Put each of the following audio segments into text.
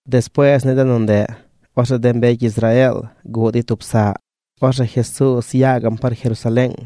Despuees ni de nu ndeꞌ, orzeꞌ de mbecy Israeel guꞌ dey tub saꞌ. Orzeꞌ Jesuuz yaa gaꞌm par Jerusaleeng.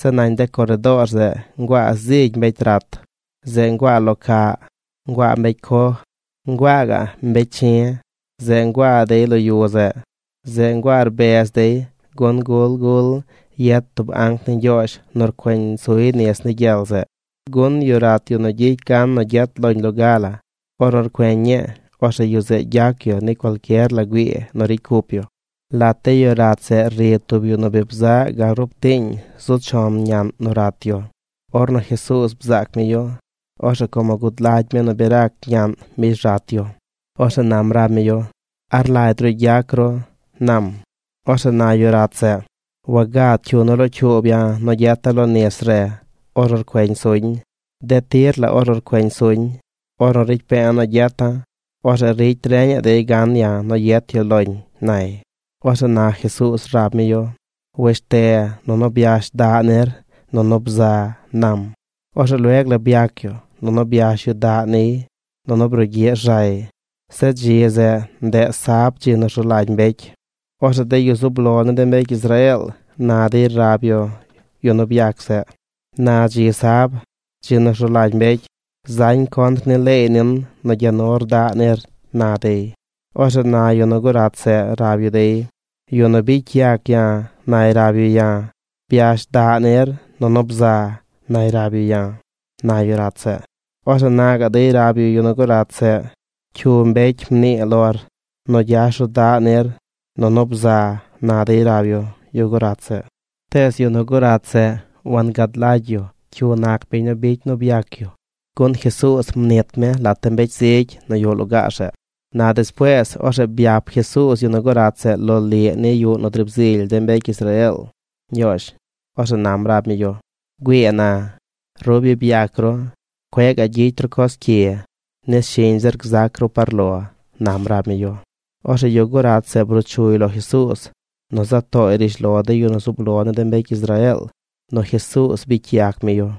Zeꞌ nañ de coredoor zeꞌ nguaa zigy mbecy rat. Zeꞌ nguaa lo caꞌ, nguaa mbecy coj, nguaa gaꞌ mbecy chi̱. Zeꞌ nguaa dey lo yu zeꞌ. Zeꞌ nguaa rbez dey gun gul gul yet tub anc ni Ñgyoozh nu rcueñ suy nis ni gyel zeꞌ, gun yu rat nu gyicy gan nu gyet loñ loga la, ornu rcueñ ñii, orzeꞌ yu zeꞌ gyac yu ni cualcyer la güii nu ricy cup yu. Lat de yu rat zeꞌ ri tub yu nu bi bzaꞌ gal rub tiiñ zu chon ñaꞌn nu rat yu. Ornu Jesuuz bzaac mi yu, orzeꞌ como gud lagy mi nu bi rac ñaꞌn mbish rat yu, orzeꞌ nam rab mi yu: ―¿A rlagy ru gyac ru? ―nam. Orzeꞌ na yu rat zeꞌ: ―Wagad cyu nu locyuub ya̱ nu gyeta̱ lo nis re ornu rcueñ suñ. De tir la ornu rcueñ suñ, ornu ricy pe̱e̱ nu gyeta̱, orzeꞌ ricy reñaꞌ dey gan ya̱ nu yet yu loñ ―nay. Orzeꞌ na Jesuuz rab mi yu: ―Wesh te nunu byash daꞌ nir nunu bza ―nam. Orzeꞌ lueg la byac yu, nunu byash yu daꞌ niy, nunu brugyiꞌ rzay. Zeꞌ dzi zeꞌ, ndeꞌ sab dzi nu rzu lagy mbecy. Orzeꞌ de yu zub lo ni de mbecy Israeel na dey rab yu yu nu byac zeꞌ: ―Na dzi sab, dzi nu rzu lagy mbecy. Zañ contr ni leey nin nu gya nur daꞌ nir ―na dey. Orzeꞌ na yu nu gurat zeꞌ rab yu dey: ―Yu nu bicy yac ya̱ nay rab yu ya̱: “Byash daꞌ nir nunu bza”, nay rab yu ya̱ ―na yu rat zeꞌ. Orzeꞌ na gaꞌ dey rab yu yu nu gu rat zeꞌ: ―¿Cyu mbecy nu mnii lor nu gyash ru daꞌ nir, nunu bza? ―na dey rab yu yu gurat zeꞌ. Tees yu nu gurat zeꞌ wangad lagy yu cyu nac biñ nu bicy nu byac yu, gun Jesuuz mnit mi lat de mbecy zigy nu yuꞌ lugaar zeꞌ. Na despuees, orzeꞌ byap Jesuuz yu nu gurat zeꞌ loliꞌ ni yuꞌ nu driib zily de mbecy Israeel Ñgyoozh. Orzeꞌ nam rab mi yu: ―Güii na, ru bi byac ru. Cueꞌ gaꞌ gyicy ru coz cyi, nis shiñ zir gzac ru par lo ―nam rab mi yu. Orzeꞌ yu gurat zeꞌ bruu chuy lo Jesuuz nu za tooy rishlo de yu zub lo ni de mbecy Israeel nu Jesuuz bicy yac mi yu.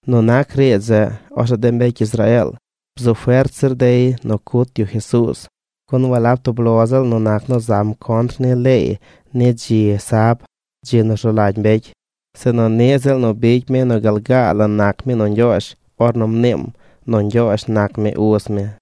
Nu nac riidz zeꞌ, orzeꞌ de mbecy Israeel bzu fert zir dey nu cut yu Jesuuz, gun walab tub lo ziꞌl nu nac nu zam contr ni leey ni dzi sab, dzi nu rzu lagy mbecy, sinu niꞌ ziꞌl nu bicy mi nu gal gaa la nac mi nu Ñgyoozh ornu mniim nu Ñgyoozh nac mi uz mi.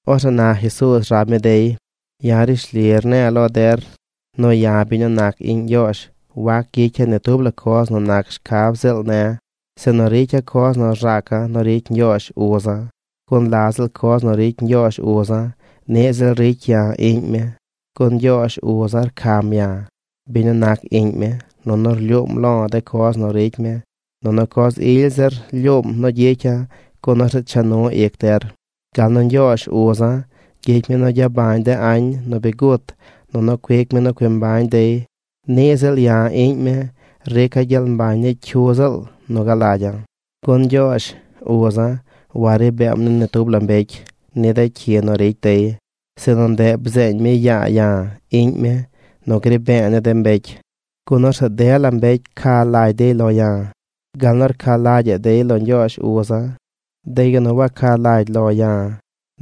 Orzeꞌ na Jesuuz rab mi dey: ―Ya̱ rishli rne̱e̱ lo der nu ya̱ biñ nu nac iꞌñ Ñgyoozh wac gyicya̱ ni tub la coz nu nac shcab ziꞌl ne̱, sinu ricya̱ coz nu rzaca̱ nu ricy Ñgyoozh uza̱. Gun la ziꞌl coz nu ricy Ñgyoozh uza̱ niꞌ ziꞌl ricy ya̱ iꞌñ mi. Gun Ñgyoozh uza̱ rcam ya̱, biñ nu nac iꞌñ mi, nunu rlyuum lo̱ de coz nu ricy mi; nunu coz ily zir lyuum nu gyicya̱ gun orzeꞌ cha nu ic der. Gal nu Ñgyoozh uza̱ gyicy mi nu gyabañ de añ nu bi gut nunu cuic mi nu cui mbañ dey, niꞌ ziꞌl ya̱, iꞌñ mi, rica̱ gyel mbañ ni cyu ziꞌl nu galagya̱. Gun Ñgyoozh, uza̱, wari beem ni ni tub la mbecy ni de cyi nu ricy dey, sinu ndeꞌ bzeeñ mi yaa ya̱, iꞌñ mi, nu gri be̱e̱ ni de mbecy. Gun orzeꞌ dela mbecy ca lagy dey lo̱ ya̱, gal nu rca lagyaꞌ dey lo Ñgyoozh uza̱. De yu nu waca lagy lo ya̱,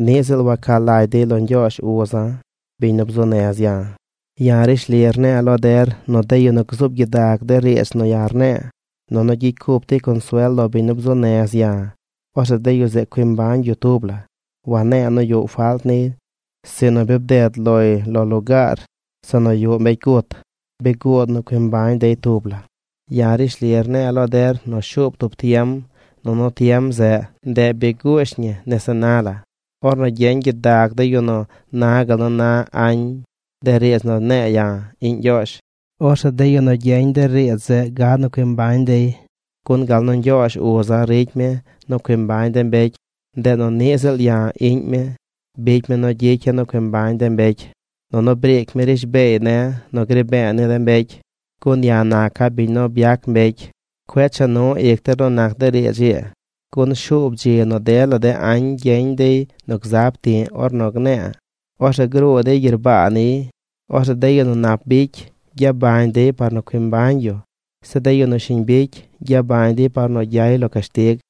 niꞌ ziꞌl waca lagy dey lo Ñgyoozh uza̱, biñ nu bzuu nez ya̱. ’Ya̱ rishli rne̱e̱ lo der nu de yu nu gzuub gyidag de riidz nu ya̱ rne̱e̱, nunu gyicy cup dey consuel lo biñ nu bzuu nez ya̱, orzeꞌ de yu zeꞌ cui mbañ yu tub la. Wane̱e̱ nu yuꞌ falt niy, sinu bi bded loy lo lugaar zeꞌ nu yuꞌ mbecy gut. Bi guud nu cui mbañ dey tub la. Ya̱ rishli rne̱e̱ lo der nu shuub tub tiem, nunu tiem zeꞌ, ndeꞌ bi guush ñi nese na la, ornu gyeñ gyidag de yu nu na gal nu na añ de riidz nu ne̱e̱ ya̱, iꞌñ Ñgyoozh, orzeꞌ de yu nu gyeñ de riidz zeꞌ gad nu cui mbañ dey. Gun gal nu Ñgyoozh uza̱ ricy mi nu cui mbañ de mbecy, ndeꞌ nu niꞌ ziꞌl ya̱, iꞌñ mi bicy mi nu gyicya̱ nu cui mbañ de mbecy. Nunu briic mi rishbeey ne̱ nu gri be̱e̱ ni de mbecy, gun ya̱ naca̱ biñ nu byac mbecy. Cueꞌ cha nu ic der nu nac de riidz ii, gun shuub dzi nu dela de añ gyeñ dey nu zaab ti̱ꞌ ornu gne̱e̱. Orzeꞌ gruu dey gyerbaa niy. Orzeꞌ de yu nu nap bicy, gyabañ dey par nu cui mbañ yu. Zeꞌ de yu nu shiñ bicy gyabañ dey par nu gyay lo cashtig.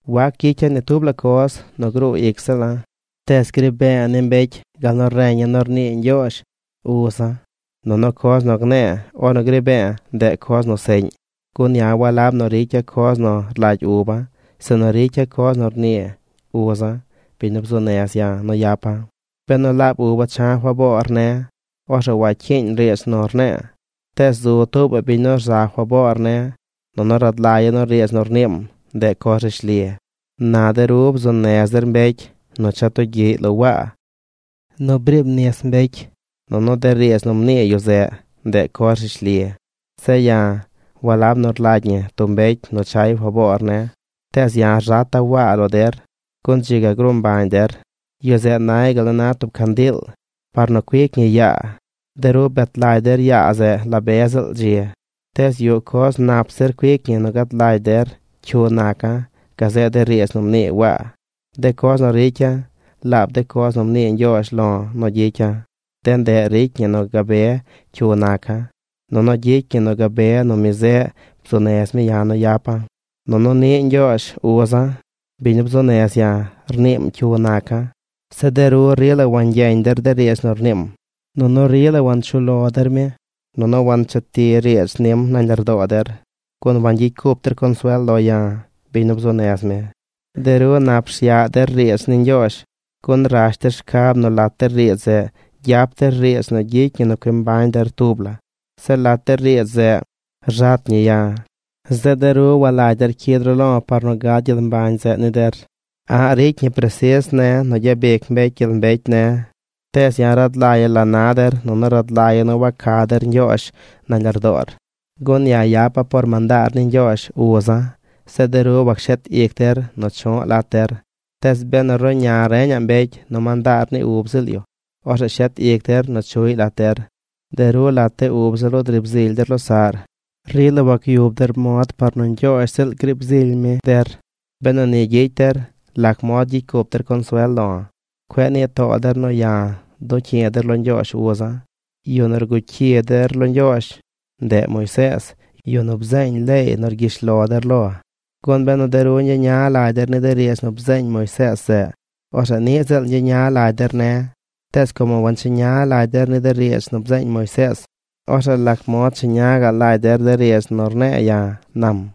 ’Wac gyicya̱ ni tub la coz nu gruu ic ziꞌla̱. Tees gri be̱e̱ ni mbecy gal nu reña̱ nu rnii Ñgyoozh, uza̱. Nunu coz nu gne̱e̱ ornu gri be̱e̱, ndeꞌ coz nu seꞌñ, gun ya̱ walab nu ricya̱ coz nu rlagy uba̱, sinu ricya̱ coz nu rnii uza̱, biñ nu bzuu nez ya̱ nu yapa̱. Benu laab uba̱ cha̱ faboor ne̱, orzeꞌ wacyiiñ riidz nu rne̱e̱. Tees zu tuubaꞌ biñ nu rza faboor ne̱, nunu rad lagya̱ nu riidz nu rniim, ndeꞌ coz rishli. Na de ru bzuu nez der mbecy nu cha tugyiꞌy lo Waa nu driib nis mbecy, nunu de riidz nu mnii yu zeꞌ, ndeꞌ coz rishli. Zeꞌ ya̱, walab nu rlagy ñi tub mbecy nu chay faboor ne̱, tees ya̱ rzata̱ Waa lo der gun dzi ga gruu mbañ der. Yu zeꞌ nay gal nu na tub candiil par nu cuic ñi yaa. De ru bet lagy der yaa zeꞌ la be ziꞌl dzi. Tees yuꞌ coz nap zir cuic ñi nu gad lagy der cyu naca̱ gazeꞌ de riidz nu mnii Waa. De coz nu ricya̱, laab de coz nu mnii Ñgyoozh lo̱ nu gyicya̱, de ndeꞌ ricy ñi nu gabe cyu naca̱, nunu gyicy ñi nu gabe nu mi zeꞌ bzuu nez mi ya̱ nu yapa̱. Nunu niꞌ Ñgyoozh, uza̱, biñ nu bzuu nez ya̱ rniim cyu naca̱. Zeꞌ de ru rila wangyeñ der de riidz nu rniim, nunu rila wanchuꞌ lo der mi. Nunu wancheti riidz nim nañ lardoo der, gun wangyicy cup der consuel lo ya̱, biñ nu bzuu nez mi. De ru nap rsyaꞌ der riidz ni Ñgyoozh gun rash der shcab nu lat de riidz zeꞌ gyap der riidz nu gyicy ñi nu cui mbañ der tub la. Zeꞌ lat de riidz zeꞌ rzat ñi ya̱. Zeꞌ de ru walagy der cyid ru lo̱ par nu gad gyel mbañ zeꞌ ni der. ’A̱ꞌ ricy ñi presis ne̱ nu gyabic mbecy gyel mbecy ne̱. Tees rad lagya̱ la na der nunu rad lagya̱ nu waca der Ñgyoozh nañ lardoor. Gun ya̱ yapa̱ por mandaar ni Ñgyoozh uza̱. Zeꞌ de ru wacshet ic der nu chu̱ꞌ lat der. Tees benu ruꞌña reñaꞌ mbecy nu mandaar ni ub ziꞌl yu, orzeꞌ rshet ic der nu chuꞌy lat der. De ru, lat de ub ziꞌl ru, driib zily der losaꞌr. Rila wagyub der mod par nu Ñgyoozh ziꞌl griib zily mi der. Benu ni gyicy der, ¿lac mod gyicy cup der consuel lo̱? Cueꞌ nii too der nu ya̱ du̱ꞌ cyi̱ der lo Ñgyoozh uza̱. Yu nu rguꞌ cyi der lo Ñgyoozh, ndeꞌ Moisees, yu nu bzeeñ leey nu rgyish lo der lo. Gun benu de ru ñgyeña lagy der ni de riidz nu bzeeñ Moisees zeꞌ, orzeꞌ niꞌ ziꞌl ñgyeña lagy der ne̱. Tees como wancheña lagy der ni de riidz nu bzeeñ Moisees, orzeꞌ lac mod cheña gaꞌ lagy der de riidz nu rne̱e̱ ya̱ ―nam.